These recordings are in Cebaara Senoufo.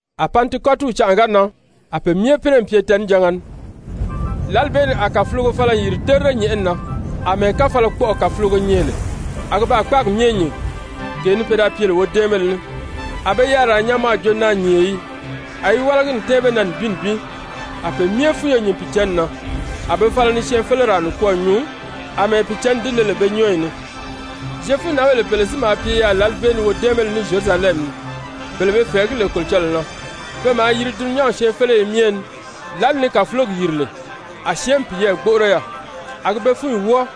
A Pantikɔtiw canʔa ga nan, a be myɛ pínɛ n pye tɛɛnijanga ni. Lǎli bee ni a kàfulogo fala n yìri terire nyɛ̀ʔɛni na, àmɛɛ káfalakpɔʔɔ kàfulogo nyɛ lè, a gi baa kpáagi myɛ nyìn, gee ni pe da pye lè wodɛ́ɛnbéle ní. A be yariraa nyaa mɔ a jo naanyìnye yii. A yi wálagi n tɛ́ɛn be na nibin nibin. A pe myɛ fúnyo nyìn Pìicǎnni na, a be fala ni syɛɛnfeleraa nikwɔɔ nyuu àmɛɛ Pìicǎnni di le lè be nyɔ́ɔyi ni. Zyefunǎnbèle pèle si maa pye yaà lǎli bee ni wodɛ́ɛnbéle ní Zyerusalɛmi ni, bele be fɛ̀ɛgí lè Kolocɔlɔɔ na, pe maa yiri dulunyanw syɛɛnfeleye myɛ ni. Lǎli ni kàfulogi yìri lè, a syɛ́ɛnmi piyɛɛ gbóʔoro yaà, a gi be fúnyi wɔ́ɔ,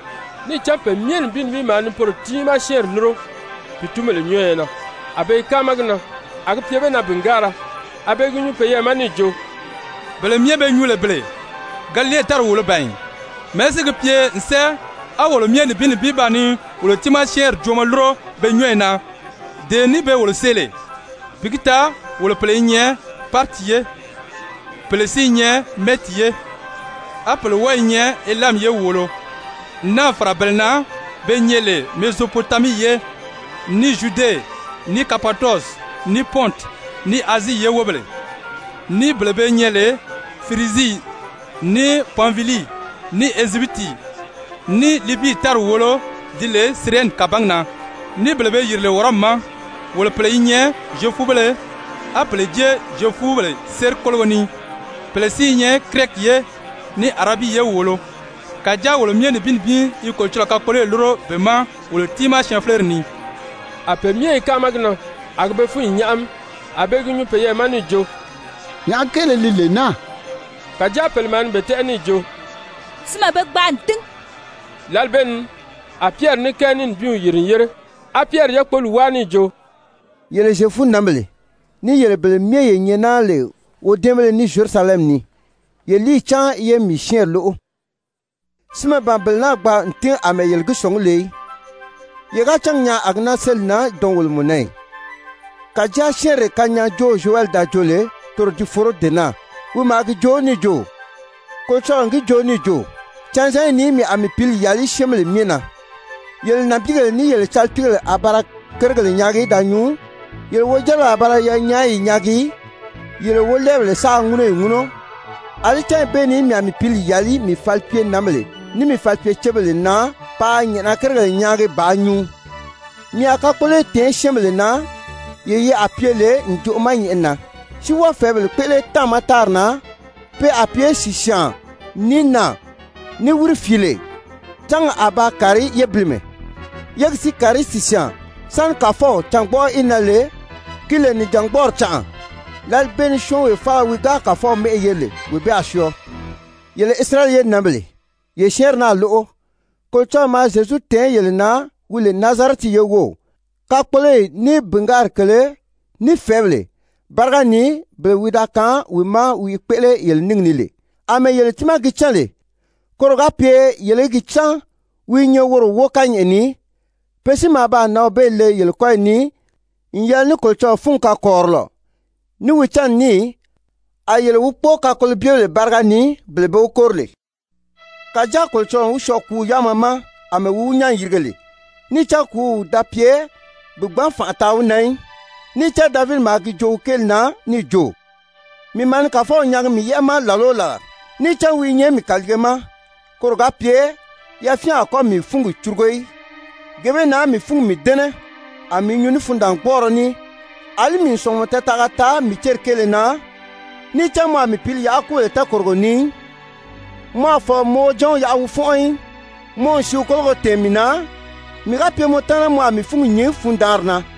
níì cán pe myɛ nibin nibin maa ni poro tiimaa syɛ́ɛnri lúro pìitunbèle nyɔ́ɔyɔ na. A be i káama gi na, a gi pye be na bìngaara, a be i gi nyuu peyɛɛ ma níì jo: «Bele myɛ be nyuu lè bele, Galile tári wòolo ban ì? Mɛ̀ɛ́ si gi pye n sɛ́ɛ á wolo myɛ nibin nibin ba ni wolo tiimaa syɛ́ɛnri joomɔ lúro be nyɔ́ɔyi na, dee ni be wolo see lè? Bi gi taa wolo pèle i nyɛ Pariti ye, pèle si i nyɛ Mɛdi ye, á pèle wɔ́ɔ i nyɛ Elami ye wòolo, n náà fàra bele na be nyɛ lè Mezopotamii ye, ní Zyude, ní Kapadɔsi, ní Pɔnti, ní Azii ye wóbèle, ní bele be nyɛ lè Firizii, ní Panfilii, ní Ezyipiti, ní Libii tári wòolo di lè Sirɛni kàbangi na, ní bele be yìri lè Wɔrɔmi ma. Wolo pèle i nyɛ Zyefubéle, á pèle jée Zyefubèle séri kólogo ni, pèle si i nyɛ Kirɛti ye, ní Arabii ye wòolo, kàjáa wolo myɛ nibin nibin i Kolocɔlɔɔ kakpoloyi lúro be ma wolo tiimaa syɛɛnfeleri ni!» A pe myɛ i káama gi na, a gi be fúnyi nyáʔami. A be i gi nyuu peyɛɛ ma níì jo: «Nyàʔá kéele li lee naa?» Kàjáa pèle maa ni be tɛ́ʔɛ níì jo: «Sinmɛ be gbaa n tín.» Lǎli bee ni a Pyɛri ní kɛɛ ní nibinw yìri n yére á Pyɛri yákpoli wáa níì jo: «Yele Zyefunǎnbèle, ní yele bele myɛ ye nyɛ naa lè wodɛ́ɛnbéle ní Zyerusalɛmi ni, ye líiyi cáan ye mii syɛ́ɛnri lóʔo! Sinmɛ ban bele naa gbaa n tín àmɛɛ yele gi sɔ̀ngí lè í. Ye ga cángi nyaa a gi náà séli n nan dɔnwolomɔ na ì? Kàjáa syɛ́ɛnree kanyaajoow Zyowɛli da joo lè, toro di foro dee naa, wi maa gi joo níì jo: ‹Kolocɔlɔɔ n gi joo níì jo: Canzanyi ni mii a mii Pǐli yàli syɛ́ɛnbèle myɛ na. Yele nànbiigèle, ní yele calipiigèle a ba ra kérigèle nyaagi da nyuu, yele wojáribèle a ba ra yanyaayi nyaagi, yele wolɛɛbèle sáā ŋúnɔyi ŋúnɔ. Alí cányi bee ni mii a mii Pǐli yàli mii falipyenǎnbèle, ní mii falipyecebèle na paa nyɛ̀ʔɛna kérigèle nyaagi bàā nyuu. Mii a kakpoloyi tɛ̀ɛn syɛ́ɛnbèle na, yee yi a pye lè ǹjoʔo ma nyɛ̀ʔɛni na, si wɔ́ɔ fɛ̀ɛ́bèle kpéʔele táàma tári na, pe a pye sìsyaan, ní naà, ní wírifiile. Cángi a ba kàri yébilimɛ, yégi si kàri sìsyaan, sáni Kàfɔw cângbɔʔɔ í nan lè ki lè nìjangbɔɔri canʔa. Lǎli bee ni syɔ́ɔnwee faala wi ga Kàfɔw mɛ́ʔɛ yeri lè, wee bee a syɔɔ.› Yele Isirayɛli ye nǎnbèle, ye syɛ́ɛnri naa lóʔo! Kolocɔlɔɔ maa Zyezu tɛ̀ɛn yele na wi lè Nazarɛti ye wów, kakpoloyi, ní bìngaari kèlē, ní fɛ̀ɛ́bèle báriga ni bele wi da kaan wi ma a wi i kpéʔele yele níngi ni lè, àmɛɛ yele tiimaa gi cán lè, koro ga pye yele í gi cán wi i nyɛ woro wóo kányɛʔɛ ni. Pe si maa baa nǎnw bee le yele kɔ́yi ni n yɛlɛ ní Kolocɔlɔɔ fúngi kakɔrirɔlɔ, ní wi cánni ní, a yele wi kpóo kakolobyebèle báriga ni, bele be wi kóri lè. Kàjáa Kolocɔlɔɔ n wi syɔɔ kùúw yáama ma àmɛɛ wi wi nyán n yirige lè. Níì cán kùúw da pye bi gbǎn fànʔa taa wi na í. Níì cán Davidi maa gi joo wi kéeli na níì jo: ‹Mii maa ni Kàfɔw nyaagi mii yɛ́ʔɛ ma làla o làla. Níì cán wi i nyɛ mii kàliige ma, koro ga pye yafyɛn a kɔ́ mii fúngi curugo í. Gee bee na mii fúngi mii dɛ́nɛ, a mii i nyuu ní fundaangbɔɔrɔ ní. Alí mii n sɔ̀ngumɔ tɛɛtaʔaga taa mii céri kéele na. Níì cán mɔ a mii pǐli yaʔa kúbèle tɛɛkòrogo ni í, mɔ a fɔ̀lɔ bi mɔ Wojanw yaʔa wi fɔ́nʔɔ í. Mɔ n sìíw kóloyo tɛ̀ɛn mii na, mii ga pye mɔ taana mɔ a mii fúngi nyìn fundaanri na.›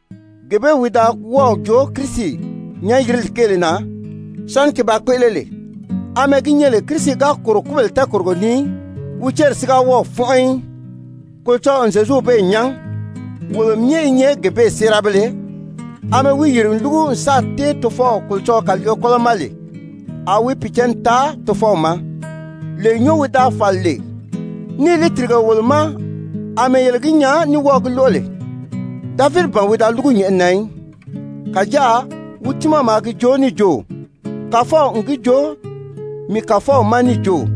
gee bee wi da wɔ́ɔ̀ joo Kirisi nyán-yirili kéele na sáni ki ba kpéʔele lè, àmɛɛ gi nyɛ lè Kirisi ga kòro kúbèle tɛɛkòrogo ni í, wi céri si ga wɔ́ɔ̀ fɔ́nʔɔ í. Kolocɔlɔɔ n Zyezuw bee nyán. Wolo myɛ i nyɛ gee bee séerabéle. Amɛɛ wi yìri n lúgu n sáà tɛ́ɛn Tofɔw Kolocɔlɔɔ kàliige kɔ́lɔ ma lè, a wi Pìicǎnni taa Tofɔw ma, lee nyɔ́ɔ wi da fàli lè, níì li tìrige wolo ma àmɛɛ yele gi nyaa ní wɔ́ɔ̀ gi lóʔo lè. Davidi ban wi da lúgu nyɛ̀ʔɛni na í, kàjáa wi tiimaa maa gi joo níì jo: ‹Kàfɔw n gi joo mii Kàfɔw ma níì jo: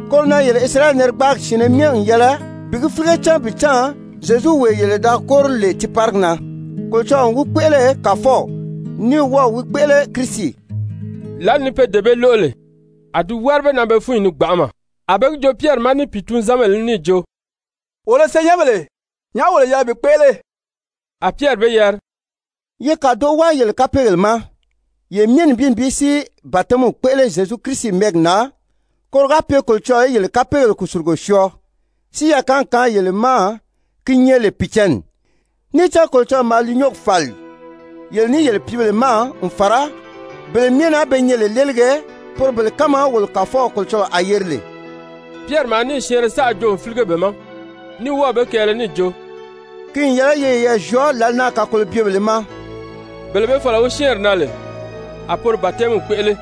Koro na yele Isirayɛli narigbaagi syɛ̀ɛnnɛ myɛ n yɛlɛ bi gi fílige cán bi cán Zyezuwee yele da kóri lè tiiparigi na, Kolocɔlɔɔ n wi kpéʔele Kàfɔw, ní wɔ́ɔ̀ wi kpéʔele Kirisi.» Lǎli ni pe dee bee lóʔo lè, a di wári be na be fúnyi ni gbanʔama, a be gi joo Pyɛri ma ní pìitunzanbèle ní níì jo: «Wolo senyɛnbèle, nyàʔá wolo yɛlɛ bi kpéʔele?» A Pyɛri be yari: «Ye kàdoʔo wáa yele kapeegèle ma, yele myɛ nibin nibin si batɛmiw kpéʔele Zyezu Kirisi mɛ́ɛgi na, koro ga pye Kolocɔlɔɔ í yele kapeegèle kùsulugo syɔɔ, si yakaangi kaan yele ma gi nyɛ lè Pìicǎnni. Níì cán Kolocɔlɔɔ maa li nyɔ́ɔgi fàli yele ní yele pìíbèle ma n fàra bele myɛ na be nyɛ lè léelige, poro bele kánma wolo Kàfɔw Kolocɔlɔɔ a yeri lè.» Pyɛri maa níì syɛɛnrɛ saʔa joo n fílige be ma, ní wɔ́ɔ̀ be kɛɛlɛ níì jo: «Ki n yɛlɛ ye yeyɛɛ zyɔɔ lǎli naa kakolobyebèlē ma.» Bele be fɔ̀lɔ wi syɛ́ɛnri na lè, a poro batɛmiw kpéʔele.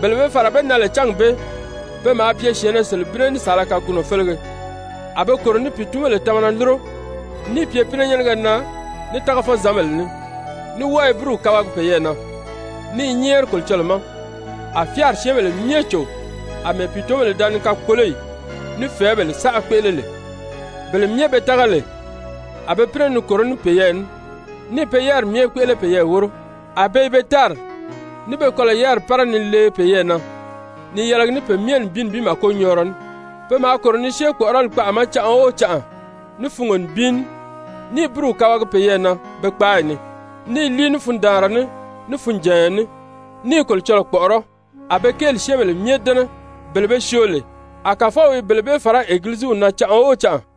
Bele be fàra be na lè cángi bee. Pe maa pye syɛ̀ɛnnɛ selebinnɛ ní saala kagunɔ félege. A be kòro ni pìitunbèle tamana lúro, níì pye pínɛnyɛnnɛgɛ na ní tágafɔzanbèle ní, ní wɔ́ɔ i búruw kabagi peyɛɛ na, ní i nyɛ́ɛri Kolocɔlɔɔ ma. A fyáari syɛ́ɛnbèle myɛ cò àmɛɛ pìitunbèle da ni kakpoloyi ní fɛ̀ɛ́bèle saʔa kpéʔele lè. Bele myɛ be tága lè, a be pínɛ ni kòró ní peyɛɛ ní, níì pe yáriri myɛ kpéʔele peyɛɛ wóro. A be i be tári ní be kɔlɔ̀ yáriri pára ni lee peyɛɛ na ni yɛlɛgi ní pe myɛ nibin nibin màkonyɔɔrɔ ní. Pe maa kòro ni syée kpɔ̀ʔɔrɔli kpaʔa ma canʔa o canʔa ní fungo nibin ní, ní i búruw kabagi peyɛɛ na be kpáayi ni, ní i líi ní fundaanra ní, ní funjànya ní, ní i Kolocɔlɔɔ kpɔ̀ʔɔrɔ́, a be kéeli syɛ́ɛnbèle myɛ dɛ́nɛ. Bele be syoo lè, a Kàfɔw i bele bee fàrá Egiliziw na canʔa o canʔa.